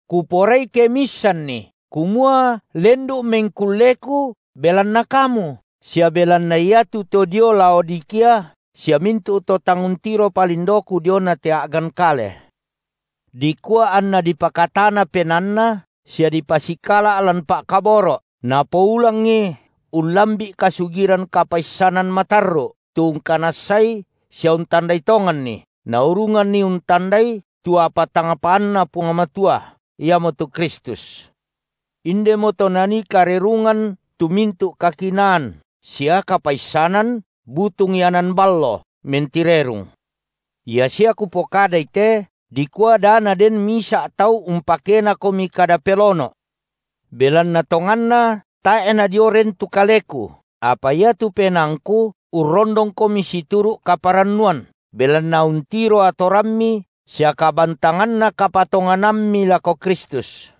Kuporai ke miissanni kumua lendu’ mengkulleku belanna kamu sia belanna iatu to dio Laodikia sia mintu’ tu to tang untiropa lindoku diona te a’gan kale, – dikua anna dipakatana penaanna sia dipasikala’ lan pa’kaboro’, napoulangi ullambi’ kasugiran kapaissanan matarru’, tu ungkanassai sia untandai tonganni, naurunganni untandai tu apa tang paanNa Puang Matua, iamotu Kristus. Indemoto nanii karerungan tu mintu’ kakinaan sia kapaissanan butung ianan ballo, mentirerung. Ia sia kupokadai te, dikua da naden misa’ tau umpakenakomi kada pelono’. Belanna tonganna tae’ nadio ren tu kaleku, apa iatu penaangku urrondongkomi situru’ kaparannuan, belanna untiro atorammi sia kabantanganna kapatonganammi lako Kristus.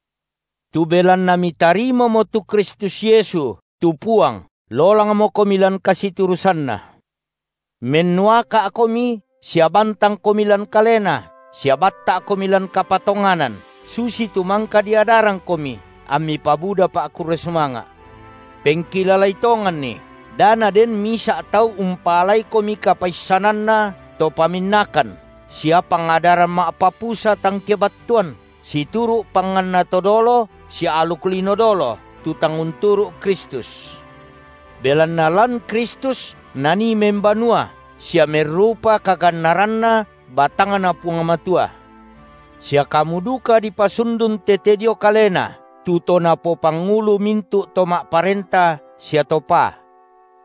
Tu belanna mitarimamo tu Kristus Yesu, tu Puang, lolangmokomi lan kasiturusanNa, mennuaka’komi sia bantangkomi lan Kalena sia batta’komi lan kapatonganan, susitu mangka diadarangkomi, ammi pabuda pa’kurre sumanga’. Pengkilalai tonganni da naden misa’ tau umpaalaikomi kapaissananna to paminnakan sia pangadaran ma’papusa tang kebattuan, situru’ panganna to dolo sia aluk lino dolo, tu tang unturu’ Kristus; belanna lan Kristus Nanii membanua sia merrupa kagannaranNa batangNa Puang Matua, sia kamu duka dipasundun tete dio Kalena, tu to napopangulu mintu’ to ma’parenta sia to paa.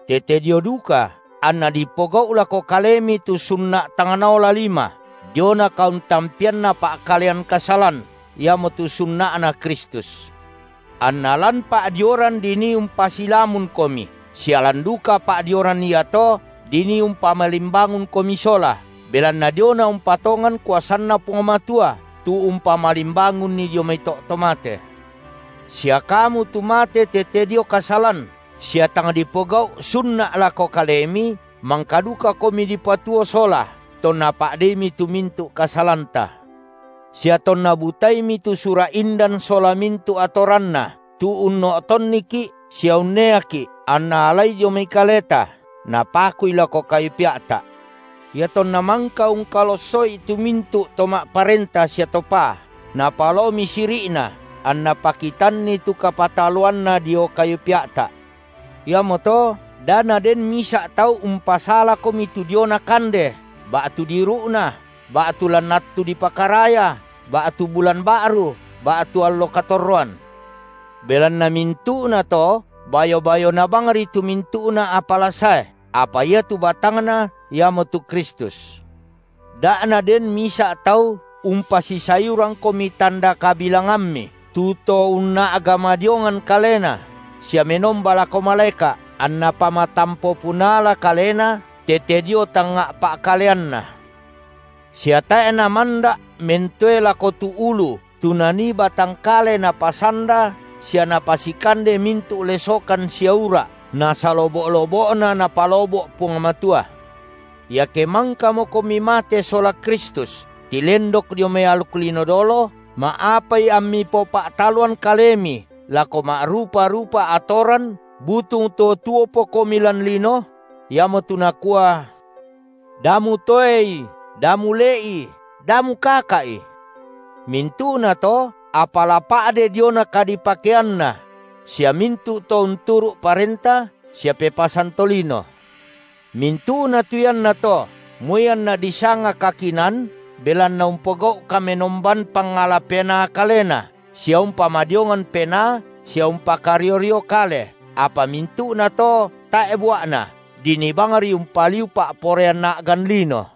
Tete dio duka anna dipogau’ lako kalemi tu sunna’ tang naola lima, diona kauntampeanna pa’kalean kasalan, iamotu sunna’Na Kristus. Anna lan pa’dioran dinii umpasilamunkomi, sia lan duka pa’dioran iato dinii umpamalimbangunkomi sola, belanna diona umpatongan kuasanNa Puang Matua tu umpamalimbangunNi dio mai to’ to mate. Sia kamu tu mate tete dio kasalan sia tang dipogau’ sunna’ lako kalemi, mangka dukakomi dipatuo sola, tonna pa’deimi tu mintu’ kasalanta, sia tonna butaimi tu sura’ indan sola mintu’ atoranna, tu unno’tonniki’ sia unneaki’; anNa alai dio mai kaleta, Napakui lako kayu pea’ta’. Iatonna mangka ungkalosso’i tu mai to ma’parenta sia to paa, Napalaomi siri’na, anNa pakitanni tu kapataloanNa dio kayu pea’ta’. Iamoto da naden misa’ tau umpasalakomi tu diona kande ba’tu diiru’na ba’tu lan attu dipakaraya ba’tu bulan ba’ru ba’tu allo katorroan, belanna mintu’nato bayo-bayona bangri tu mintu’na apa la sae, apa iatu batangna iamotu Kristus. Da’ naden misa’ tau umpasisayurangkomi tanda kabilangammi, tu to unna’ga madiongan kalena sia menomba lako malaeka’, anna pamatampo punala kalena tete dio tangnga’ pa’kaleanna, sia tae’ namanda’ mentoe lako tu Ulu, tu nanii batang kale napasanda sia napasikande mintu’ lesokan sia ura’, nasalobo’-lobo’na Napalobo’ Puang Matua. Iake mangkamokomi mate sola Kristus tilendok dio mai aluk lino dolo, ma’apai ammi popa’taloan kalemi lako ma’rupa-rupa atoran butung to tuopokomi lan lino? iamotu nakua: Da mutoei, da mule’i, da mukaka’i! Mintu’nato apa la pa’de diona kadipakeanna; sia mintu’ to unturu’ parenta sia pepasan tolino. Mintu’na tu iannato, moi anna disanga kakinaan, belanna umpogau’ kamenomban pangala penaa kalena sia umpamadiongan penaa sia umpakario-rio kale, apa mintu’nato tae’ bua’na, dinii bangri umpaliu pa’poraian a’gan lino.